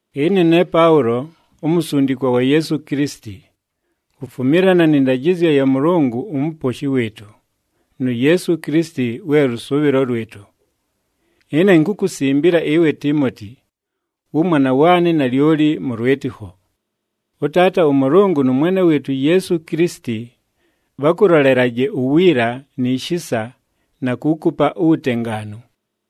Ɨne ne Paʉlo, umusundikwa wa Yeesu Kilisiti, kufumilana nɨ ndajɨzyo ya Mʉlʉngʉ uMuposhi wɨɨtʉ, nu Yeesu Kilisiti we lʉsʉʉbhɨlo lwɨtʉ. Ɨne inkukusimbila ɨwe Tiimoti, wʉmwana waanɨ nalyoli mʉ lwɨtɨkho. ɄTaata ʉMʉlʉngʉ nʉ Mwene wɨɨtʉ uYeesu Kilisiti, bhakʉlolelaje uwiila ni shisa, na kuukupa uwutengaanu.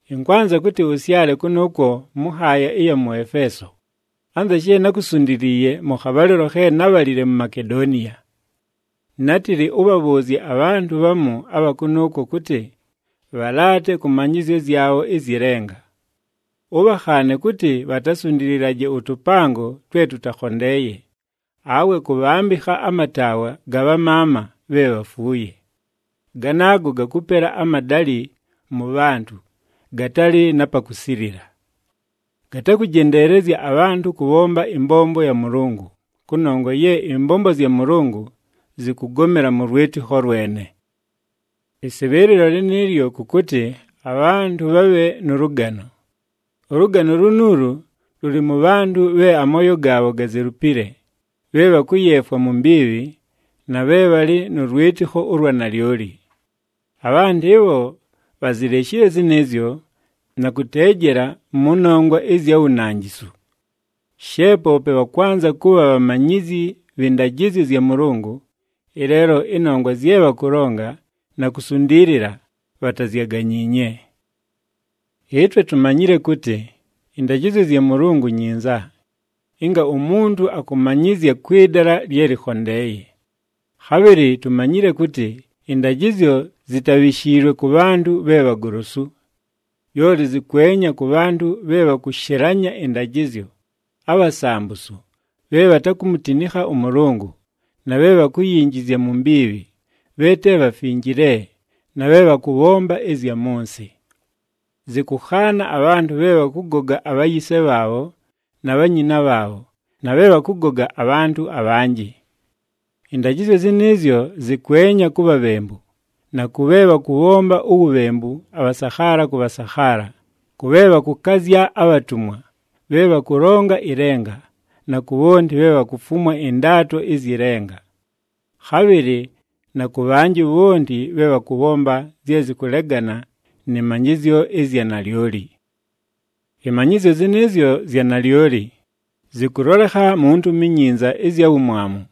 Ɨnkwanza kʉtɨ ʉsyale kʉnʉʉkwo mʉ nhaaya ɨya mʉ Efeeso, anza she nákusundiliiye mʉ khabhalɨlo khe nábhalile mu Makedoniya. Nátɨlɨ ʉbhabhʉʉzye abhantʉ bhamu abha kʉnʉʉkwo kʉtɨ, bhalaate kʉ manyɨzyo zyabho ɨzyɨ lenga. Ʉbhakhaane kʉtɨ bhatasundililaje ʉtʉpango twe tʉtakhondeeye, awe kʉbhambɨkha amataawa ga bhamaama bhe bhafuuye. Ganaago gakʉpela amadalɨ mʉ bhantʉ, gatalɨ na pa kusilila. Gatakʉjendeelezya abhantʉ kʉbhomba ɨmbombo ya Mʉlʉngʉ, kʉnongwa ye ɨmbombo zya Mʉlʉngʉ zɨkʉgomela mʉ lwɨtɨkho lwene. Ɨsɨbhɨɨlɨlo lɨnɨɨlyo kʉ kʉtɨ abhantʉ bhabhe nʉ lʉgano. Ʉlʉgano lunuulu lʉlɨ mʉ bhantʉ bhe amooyo gaabho gazelupile, bhe bhakʉyeefwa mu mbiibhi, na bhe bhalɨ nʉ lwɨtɨkho ʉlwa nalyoli. Abhantʉ ɨbho bhazileshile zɨnɨɨzyo, na kʉteejela mʉ nongwa ɨzya wunanjisu. She poope bhakwanza kʉbha bhamanyizyi bhɨ ndajɨzyo zya Mʉlʉngʉ, ɨleelo ɨnongwa zye bhakʉlonga na kusundiilila, bhatazyaganyiinye. Ɨtwe tumanyile kʉtɨ, ɨndajɨzyo zya Mʉlʉngʉ nyinza, ɨnga umuntu akʉmanyɨzya kwɨ dala lye lɨkhondeeye. Khabhɨlɨ tumanyile kʉtɨ ɨndajɨzyo zitabhishiilwe kʉ bhantʉ bhe bhagolosu. Lyoli zɨkwenya kʉ bhantʉ bhe bhakʉshɨlanya ɨndajɨzyo, abhasambusu, bhe bhatakumutinikha ʉMʉlʉngʉ, na bhe bhakuyinjizya mu mbiibhi, bhe te bhafinjile na bhe bhakʉbhomba ɨzya mʉ nsɨ. Zɨkʉkhaana abhantʉ bhe bhakʉgoga abhayise bhaabho na bhanyina bhaabho, na bhe bhakʉgoga abhantʉ abhanjɨ. Ɨndajɨzyo zɨnɨɨzyo zɨkwenya ku bhabhembu, na kʉ bhe bhakʉbhomba uwubhembu abhasakhaala kʉ bhasakhaala, kʉ bhe bhakʉkazya abhatumwa, bhe bhakʉlonga ɨlenga, na ku bhonti bhe bhakufumwa ɨndaato ɨzyɨ lenga. Khabhɨlɨ na kʉ bhanjɨ bhonti bhe bhakʉbhomba zye zɨkʉlegana nɨ manyɨzyo ɨzya nalyoli. Ɨmanyɨzyo zɨnɨɨzyo zya nalyoli, zɨkʉlolekha mu Ntumi iNyinza ɨzya wumwamu.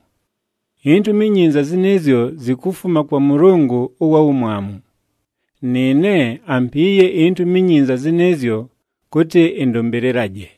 INtumi iNyinza zɨnɨɨzyo zikufuma kwa Mʉlʉngʉ ʉwa Wumwamu. Nɨɨne, ampiiye iNtumi iNyinza zɨnɨɨzyo kʉtɨ ɨndʉmbɨlɨlaje.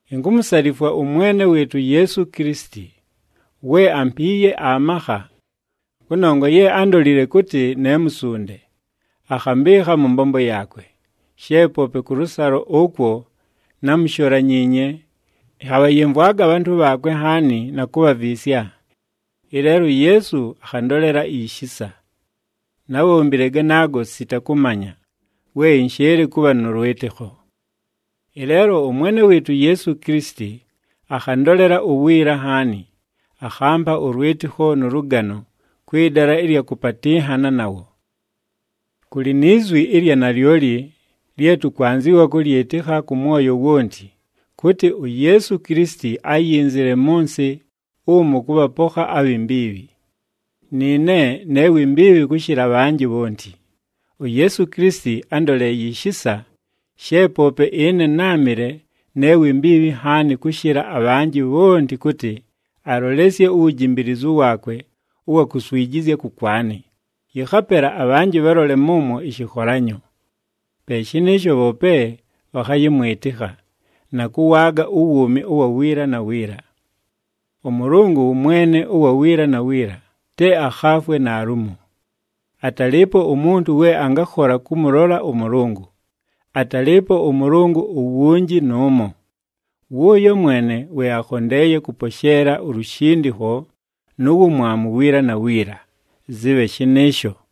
Inkumusalifwa ʉMwene wɨɨtʉ uYeesu Kilisiti, we ampiiye amakha, kʉnongwa ye ándolile kʉtɨ ne musunde, akhambɨɨkha mʉ mbombo yaakwe. She poope kʉlʉsalo ʉkwo námusholanyiinye, ɨnhabhayɨmvwaga abhantʉ bhaakwe nhaani na kubhaviisya, ɨleelo uYeesu akhandolela ishisa. Nábhombile ganaago, sita kʉmanya, we ɨnshɨɨlɨ kʉbha nʉ lwɨtɨkho. Ɨleelo ʉMwene wɨɨtʉ uYeesu Kilisiti akhandolela uwiila nhaani, akhampa ʉlwɨtɨkho nʉ lʉgano kwɨ dala ɨlya kʉpatɨnhana nawo. Kʉlɨ ni zwi ɨlya nalyoli lye tʉkwanzɨwa kʉlyɨtɨkha kʉ mwoyo wonti, kʉtɨ, “UYeesu Kilisiti áyinzile mʉ nsɨ umu kʉbhapokha abhi mbiibhi.” Nɨɨne ne wi mbiibhi kʉshɨla abhanjɨ bhonti. UYeesu Kilisiti ándoleeye ishisa, she poope ɨne náamɨle ne wi mbiibhi nhaani kʉshɨla abhanjɨ bhonti kʉtɨ, alolesye uwujimbiilizu waakwe ʉwa kuswijizya kʉkwanɨ, yɨkhapela abhanjɨ bhalole mʉmwo ɨshɨkholanyo. Pe shɨnɨɨsho bhoope bhakhayɨmwɨtɨkha, na kʉwaaga uwuumi ʉwa wiila na wiila. ɄMʉlʉngʉ wʉ Mwene ʉwa wiila na wiila, te akhaafwe naalumo. Atalɨɨpo umuntu we angakhola kʉmʉlola ʉMʉlʉngʉ, atalɨɨpo ʉMʉlʉngʉ uwunji nʉʉmo. Wʉʉyo mwene we akhondeeye kʉposheela ulushindikho nu wumwamu wiila na wiila, zɨbhe shɨnɨɨsho!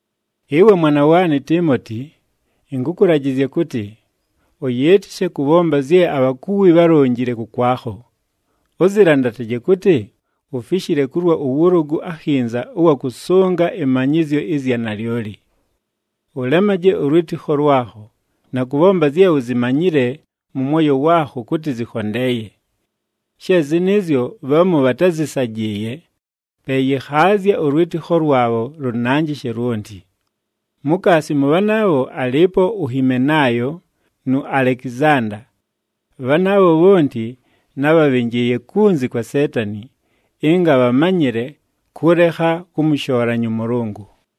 Ɨwe mwana waanɨ Tiimoti, ɨnkʉkʉlajɨzya kʉtɨ, ʉyɨɨtɨshe kʉbhomba zye abhakuwi bhálonjile kʉkwakho. Ʉzɨlandataje kʉtɨ, ufishile kulwa ʉwʉlʉgʉ akhinza ʉwa kʉsʉnga ɨmanyɨzyo ɨzya nalyoli. Ʉlemaje ʉlwɨtɨkho lwakho, na kʉbhomba zye uzimanyile mʉ mwoyo waakho kʉtɨ zɨkhondeeye. She zɨnɨɨzyo, bhamu bhatázɨsajɨɨye, pe yɨkhaazya ʉlwɨtɨkho lwabho lʉnanjɨshe lwonti. Mukaasi mʉ bhanaabho alɨɨpo uHimenaayo nu Alekizanda. Bhanaabho bhonti, nábhabhɨnjɨɨye kunzi kwa Seetani, ɨnga bhamanyɨle kʉlekha kʉmʉshoolanya ʉMʉlʉngʉ.